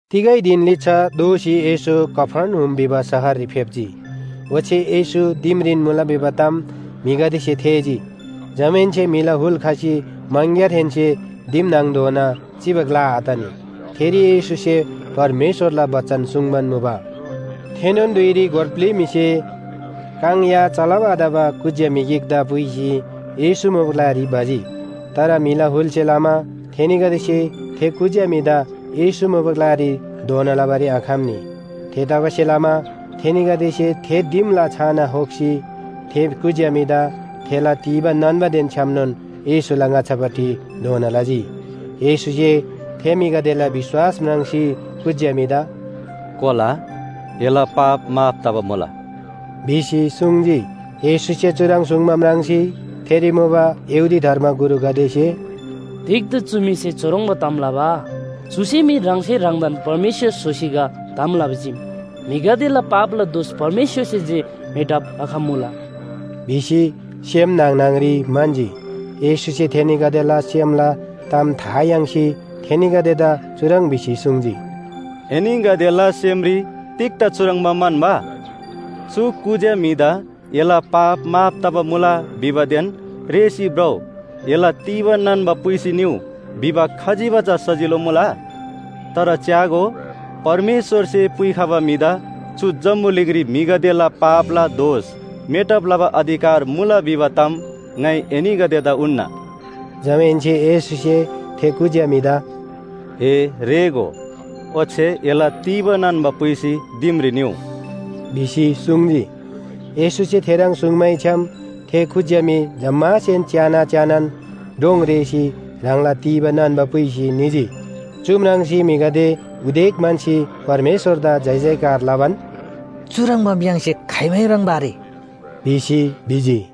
तिगै धिन लिच्‍छा दोःसी येशू कफर्नहुम भिबा शहररी फेप्‍जी। ओच्‍छे येशू दिमरीन मुला भिबा ताम म्‍हिगदेसे थेःजी। जमाहेन्‍से म्‍हिला हुल खसी मङग्‍यारहेन्‍से दिम न्‍हङधोना चिबा ग्‍ला आतनी। थेरी येशूसे परमेश्‍वरला बचन सुङ्बान मुबा। थेनोन धुइरी गोर ब्‍लि म्‍हिसे काङ या चलब आतबा कुज्‍या म्‍हि गिकदा पुइसी येशू मुबा ग्‍लारी भजी। तर म्‍हिला हुलसे लमा थेनीगदेसे थे कुज्‍या म्‍हिदा येशू मुबा ग्‍लारी धोना लबारी आखम्‍नी। थेतबासेलमा थेनीगदेसे थे दिमला छाना होक्‍सी थे कुज्‍या म्‍हिदा थेला तीबा नान्‍बादेन छ्‌यामनोन येशूला ङाच्‍छापट्टि धोना लजी। येशूसे थे म्‍हिगदेला विश्‍वास म्राङ्सी कुज्‍या म्‍हिदा “कोला, एला पाप माफ तबा मुला” भिसी सुङ्जी। येशूसे चुह्रङ् सुङ्बा म्राङ्सी थेरी मुबा यहूदी धर्मगुरुगदेसे “तिग्‍दा चु म्‍हिसे चुह्रङ्बा ताम लबा? चुसे मी ह्राङसे ह्राङदान परमेश्‍वर स्‍होसी गा ताम लबा चीम, म्‍हिगदेला पापला दोष परमेश्‍वरसे जे मेटब लखम्‍मुला” भिसी सेम न्‍हङ न्‍हङरी म्‍हन्‍जी। येशूसे थेनीगदेला सेमला ताम था याङ्सी थेनीगदेदा चुह्रङ् भिसी सुङ्जी, “एनीगदेला सेमरी तिग्‍दा चुह्रङ्बा म्‍हन्‍बा?” चु कुज्‍या म्‍हिदा ‘एला पाप माफ तबा मुला’ भिबादेन ‘रेःसी भ्रउ, एला तीबा नान्‍बा पुइसी निउ’ भिबा खजिबा चा सजिलो मुला? तर च्‍यागो, परमेश्‍वरसे पुइखबा म्‍हिदा चु जम्‍बुलिङरी म्‍हिगदेला पापला दोष मेटब लबा अधिकार मुला भिबा ताम ङाइ एनीगदेदा उन्‍ना।” जमाहेन्‍से येशूसे थे कुज्‍या म्‍हिदा “ए रेःगो, ओच्‍छे एला तीबा नान्‍बा पुइसी दिमरी निउ” भिसी सुङ्जी। येशूसे थेह्रङ् सुङ्मैछ्‌याम थे कुज्‍या म्‍हि जम्‍मासेन च्‍याना च्‍यानान डोङ रेःसी ह्राङला तीबा नान्‍बा पुइसी निजी। चु म्राङ्सी म्‍हिगदे उदेक म्‍हन्‍सी परमेश्‍वरदा जयजयकार लबान, “चुह्रङ्बाम य्‍हाङसे खाइमै म्राङ्बा आरे” भिसी भिजी।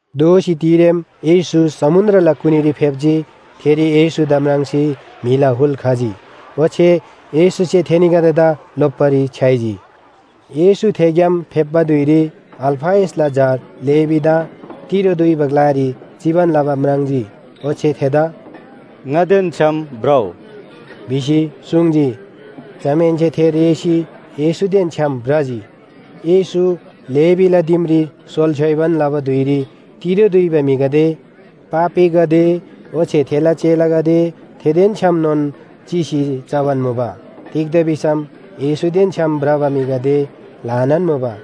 दोःसी तिरेम येशू समुन्‍द्रला कुनीरी फेप्‍जी। थेरी येशूदा म्राङ्सी म्‍हिला हुल खजी ओच्‍छे येशूसे थेनीगदेदा लोप्‍बारी छ्‌याइजी। येशू थेग्‍याम फेप्‍बा धुइरी अल्‍फयसला झा लेवीदा तिरो दुइबा ग्‍लारी चिबान लबा म्राङ्जी ओच्‍छे थेदा “ङादेन छ्‌याम भ्रउ” भिसी सुङ्जी। जमाहेन्‍से थे रेःसी येशूदेन छ्‌याम भ्रजी। येशू लेवीला दिमरी सोल छ्‌योइबान लबा धुइरी तिरो दुइबा म्‍हिगदे, पापीगदे ओच्‍छे थेला चेलागदे थेदेन छ्‌यामनोन चिसी चबान मुबा। तिग्‍दा भिसम येशूदेन छ्‌याम भ्रबा म्‍हिगदे ल्‍हानान मुबा।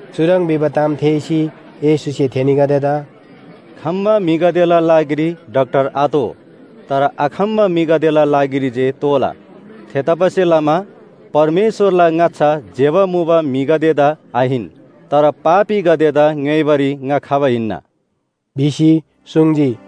चुह्रङ् भिबा ताम थेःसी येशूसे थेनीगदेदा “खम्‍बा म्‍हिगदेला लागिरी डाक्‍टर आतोः, तर आखम्‍बा म्‍हिगदेला लागिरी जे तोःला। थेतबासेलमा परमेश्‍वरला ङाच्‍छा ज्‍यबा मुबा म्‍हिगदेदा आहिन तर पापीगदेदा ङ्‌योइबारी ङा खबा हिन्‍ना” भिसी सुङ्जी।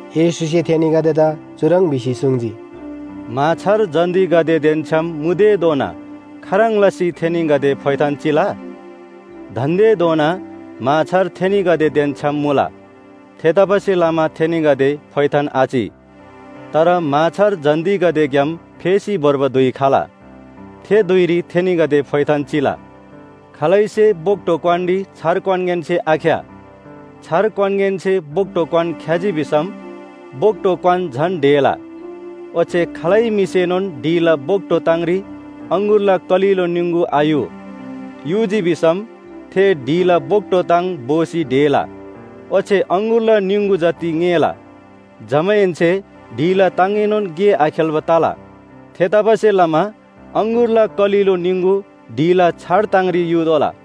येशूसे थेनीगदेदा चुह्रङ् भिसी सुङ्जी, “म्‍हाछार जन्‍तीगदेदेन छ्‌याम मुतेधोना खाह्रङ् लसी थेनीगदे फोइथान चिला? दान्‍देधोना म्‍हाछार थेनीगदेदेन छ्‌याम मुला, थेतबासेलमा थेनीगदे फोइथान आचि। तर म्‍हाछार जन्‍तीगदेग्‍याम फेसी भोर्बा धुइ खला। थे धुइरी थेनीगदे फोइथान चिला। “खालैसे बोक्‍टो क्‍वानरी छार क्‍वानगेनसे आख्‍या, छार क्‍वानगेनसे बोक्‍टो क्‍वान ख्‍याजी भिसम बोक्‍टो क्‍वान झन ढेला। ओच्‍छे खालै म्‍हिसेनोन ढिला बोक्‍टो ताङरी अङगुरला कलिलो निङगु आयु, युजी भिसम थे ढिला बोक्‍टो ताङ भोसी ढेला, ओच्‍छे अङगुरला निङगु जति ङेला। जमाहेन्‍से ढिला ताङएनोन गे आखेल्‍बा तला। थेतबासेलमा अङगुरला कलिलो निङगु ढिला छार ताङरी युतोःला।”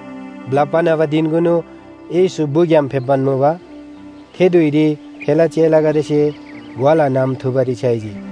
ब्‍लप्‍बा न्‍हबा धिनकुनु येशू बुग्‍याम फेप्‍बान मुबा। थे धुइरी थेला चेलागदेसे ग्‍वाला नम थुबारी छ्‌याइजी।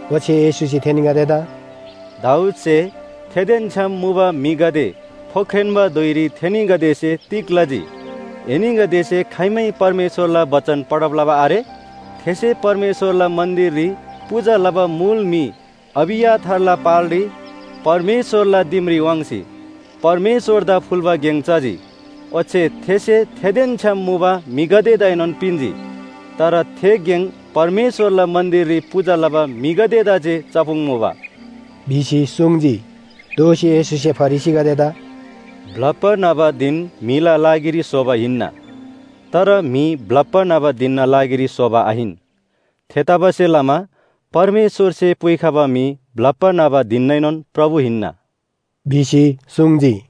ओच्‍छे येशूसे थेनीगदेदा “दाऊदसे थेदेन छ्‌याम मुबा म्‍हिगदे फोख्रेन्‍बा धुइरी थेनीगदेसे तिग लजी? एनीगदेसे खाइमै परमेश्‍वरला बचन पढब लबा आरे? थेसे परमेश्‍वरला मन्‍दिररी पूजा लबा मुल म्‍हि अबियाथारला पालरी परमेश्‍वरला दिमरी वाङ्सी, परमेश्‍वरदा फुल्‍बा गेङ चजी, ओच्‍छे थेसे थेदेन छ्‌याम मुबा म्‍हिगदेदाएनोन पिन्‍जी। तर थे गेङ परमेश्‍वरला मन्‍दिररी पूजा लबा म्‍हिगदेदा जे चपुङ्मुबा” भिसी सुङ्जी। दोःसी येशूसे फरिसीगदेदा “ब्‍लप्‍बा न्‍हबा धिन म्‍हिला लागिरी स्‍होबा हिन्‍ना, तर म्‍हि ब्‍लप्‍बा न्‍हबा धिनना लागिरी स्‍होबा आहिन। थेतबासेलमा परमेश्‍वरसे पुइखबा म्‍हि ब्‍लप्‍बा न्‍हबा धिननाएनोन प्रभु हिन्‍ना” भिसी सुङ्जी।